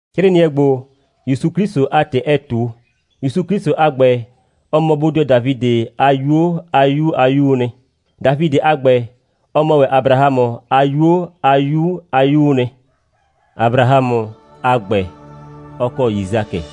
'Crɩɩnɩɛ ‑gbo, ‑Yusu 'Klɩsʋ a ‑tɩ ɛɛ ꞊tu. ‑Yusu 'Klɩsʋ a ‑gbɛ, ɔ mɔ bodɩɔ Dafidɩ a 'yuo a 'yu a 'Yuu nɩ. Dafidɩ a ‑gbɛ, ɔ mɔ ‑wɛ Abrahamʋ a 'yuo a 'yu a 'yuu nɩ. Abrahamʋ a ‑gbɛ, ɔ kɔ Yisakɩ,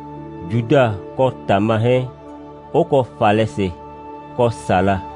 Juda kɔ Tama 'hɛɛn, 'ʋ kɔ Falɛsɩ kɔ Sala,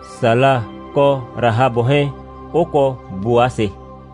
Sala kɔ Rahabʋ 'hɛɛn 'ʋ kɔ Bʋasɩ,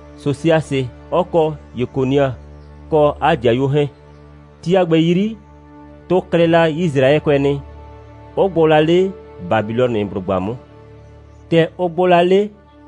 Sosiasɩ 'ɔ kɔ Yekonia kɔ 'a ‑dɩayuo 'hɛɛn. Ti a ‑gbɛ 'yri, tʋ klɩ la Yisraɛkʋɛ nɩ, 'ʋ gbʋ la 'le Babilɔnɩblʋgba 'mʋ. ‑Tɛ ʋ gbʋ la 'le,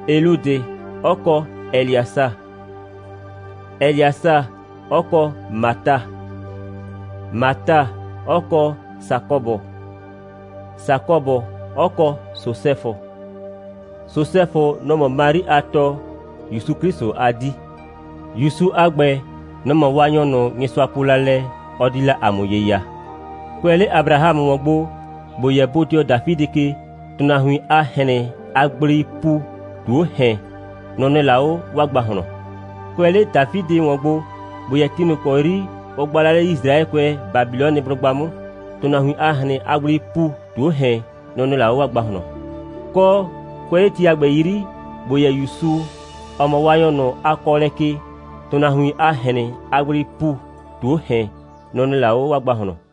Eliudɩ 'ɔ kɔ Ɛlɩasa, Ɛlɩasa 'ɔ kɔ Mata, Mata 'ɔ kɔ Sakɔbʋ, Sakɔbʋ 'ɔ kɔ Sosɛfʋ. Sosɛfʋ, nɔ‑ mɔ Mari a tɔ, ‑Yusu 'Klɩsʋ a 'dii. ‑Yusu a ‑gbɛ, nɔ‑ mɔ Waanyɔ, Nyɩsʋa po la lɛ, ɔ di la ‑a mʋ ye ya. Kʋɛ 'le Abrahamʋ ‑wɔn gbo, ‑bo yɛ bodɩɔ Dafidɩ ke, ‑tʋnahuin a ꞊hrɩn a gbleii ‑pu ꞊tu 'o ‑hɛn, nʋ‑ nɩ la 'o 'waa ‑gbahlɔn. Kʋɛ 'le Dafidɩ ‑wɔn gbo, ‑bo yɛ ti ꞊nʋ ‑kɔ 'yri ʋ gba la 'le Yisraɛkʋɛ Babilɔnɩblʋgba 'mʋ, ‑tʋnahuin a ꞊hrɩn a gbleii ‑pu ꞊tu 'o ‑hɛn, nʋ‑ nɩ la 'o 'waa ‑gbahlɔn. Kɔ, kʋɛ 'le ti a ‑gbɛ 'yri, ‑bo yɛ ‑Yusu, ‑ɔ mɔ Waanyɔ ꞊nʋ a kɔɔlɛ ke, ‑tʋnahuin a ꞊hrɩn a gbleii ‑pu ꞊tu 'o ‑hɛn, nʋ‑ nɩ la 'o 'waa ‑gbahlɔn.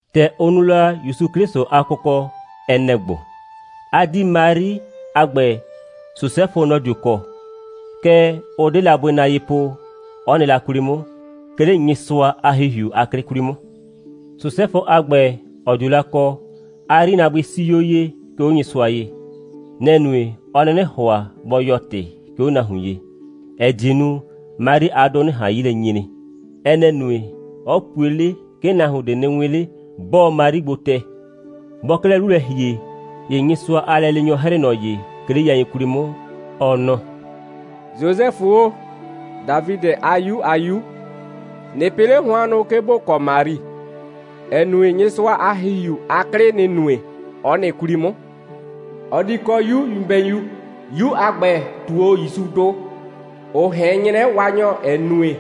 ‑Tɛ ʋ nu la ‑Yusu 'Klɩsʋ a kʋkɔ, ɛ nɛ‑ ‑gbo: 'A 'dii Mari a ‑gbɛ, Sosɛfʋ, nɔ‑ dio kɔ, kɛɛ, ʋ 'de la bʋɩ na ye po, 'ɔ nɩ la 'kwli 'mʋ, 'ke 'le Nyɩsʋa a ‑Hihiu a 'klɩ 'kwli 'mʋ. Sosɛfʋ a ‑gbɛ, ‑ɔ dio la kɔ, 'a 'yrinaabʋɩ 'sii 'o ye, 'ke 'o Nyɩsʋa ye. Nɛ‑ nue, 'ɔ 'nɩnɩ ‑hʋa bɔ yɔɔ ‑tɩ, 'ke 'o nahuin ye, ‑ɛ die nu, Mari a 'dʋ 'nɩ ꞊han 'yi lɛ nyre. Ɛ nɛ‑ nue, 'ɔ pue 'le, 'ke nahuon ꞊de nɩ 'wɩn 'le, 'bɔɔ Mari gbo tɛ. Bɔɔ 'klɛɛ 'lu lɛ ‑hie, ‑ye Nyɩsʋa a lɛleenyɔ 'hrɩɩ ꞊nɔ ye, 'ke 'le yain 'kwli 'mʋ, ɔ nɔ: «Sosɛfʋ o, Dafidɩ a 'yu a 'Yu, ꞊nɩ pɩ 'le hʋannʋ, 'ke ‑bo kɔ Mari, ‑ɛ nue, Nyɩsʋa a ‑Hihiu a 'klɩ, nɩ‑ nue, 'ɔ nɩ 'kwli ꞊nʋ 'mʋ. Ɔ di kɔ 'yu nyɩbɛyu. 'Yu a ‑gbɛ, ꞊tuo 'o ‑Yusudʋ, ‑ʋ ꞊hɛn 'nyrɛ Waanyɔ, ‑ɛ nue,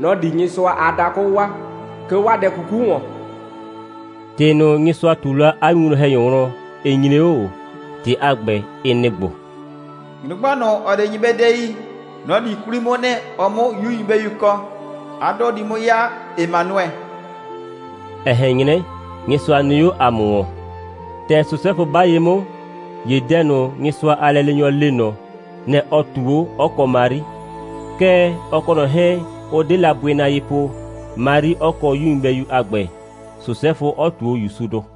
nɔ‑ di Nyɩsʋa a dakʋ waa, 'ke 'o 'waa dɛ 'kuku ‑wɔn.» ‑Tɩ ꞊nʋ, Nyɩsʋa ꞊tu la 'a winwlɔn‑hɛnyɔ wlɔn, ɩ nyre 'o ꞊o. ‑Tɩ a ‑gbɛ, ɩ nɩ‑ ‑gbo: «Nyrʋgba ꞊nʋ, ‑ɔ 'de nyɩbɛdɛ yi, nɔ‑ di 'kwli 'mʋ nɩ, ɔ 'mʋ 'yu nyɩbɛyu kɔ. 'A 'dʋ di 'mʋ 'ya Emanuɛ, ‑ɛ ꞊hɛn 'nyrɛ, Nyɩsʋa nɩ 'o ‑a mʋ ‑wɔn.» ‑Tɛ Sosɛfʋ 'ba ye 'mʋ, ‑ye dɛ ꞊nʋ, Nyɩsʋa a lɛleenyɔ le ꞊nɔ, nɛ‑ ɔ ꞊tuu 'o, 'ɔ kɔ Mari. Kɛɛ, ɔ kɔ ꞊nɔ 'hɛɛn, ʋ 'de la bʋɩ na ye po, Mari 'ɔ kɔ 'yu nyɩbɛyu a ‑gbɛ, Sosɛfʋ 'ɔ ꞊tuo ‑Yusudʋ.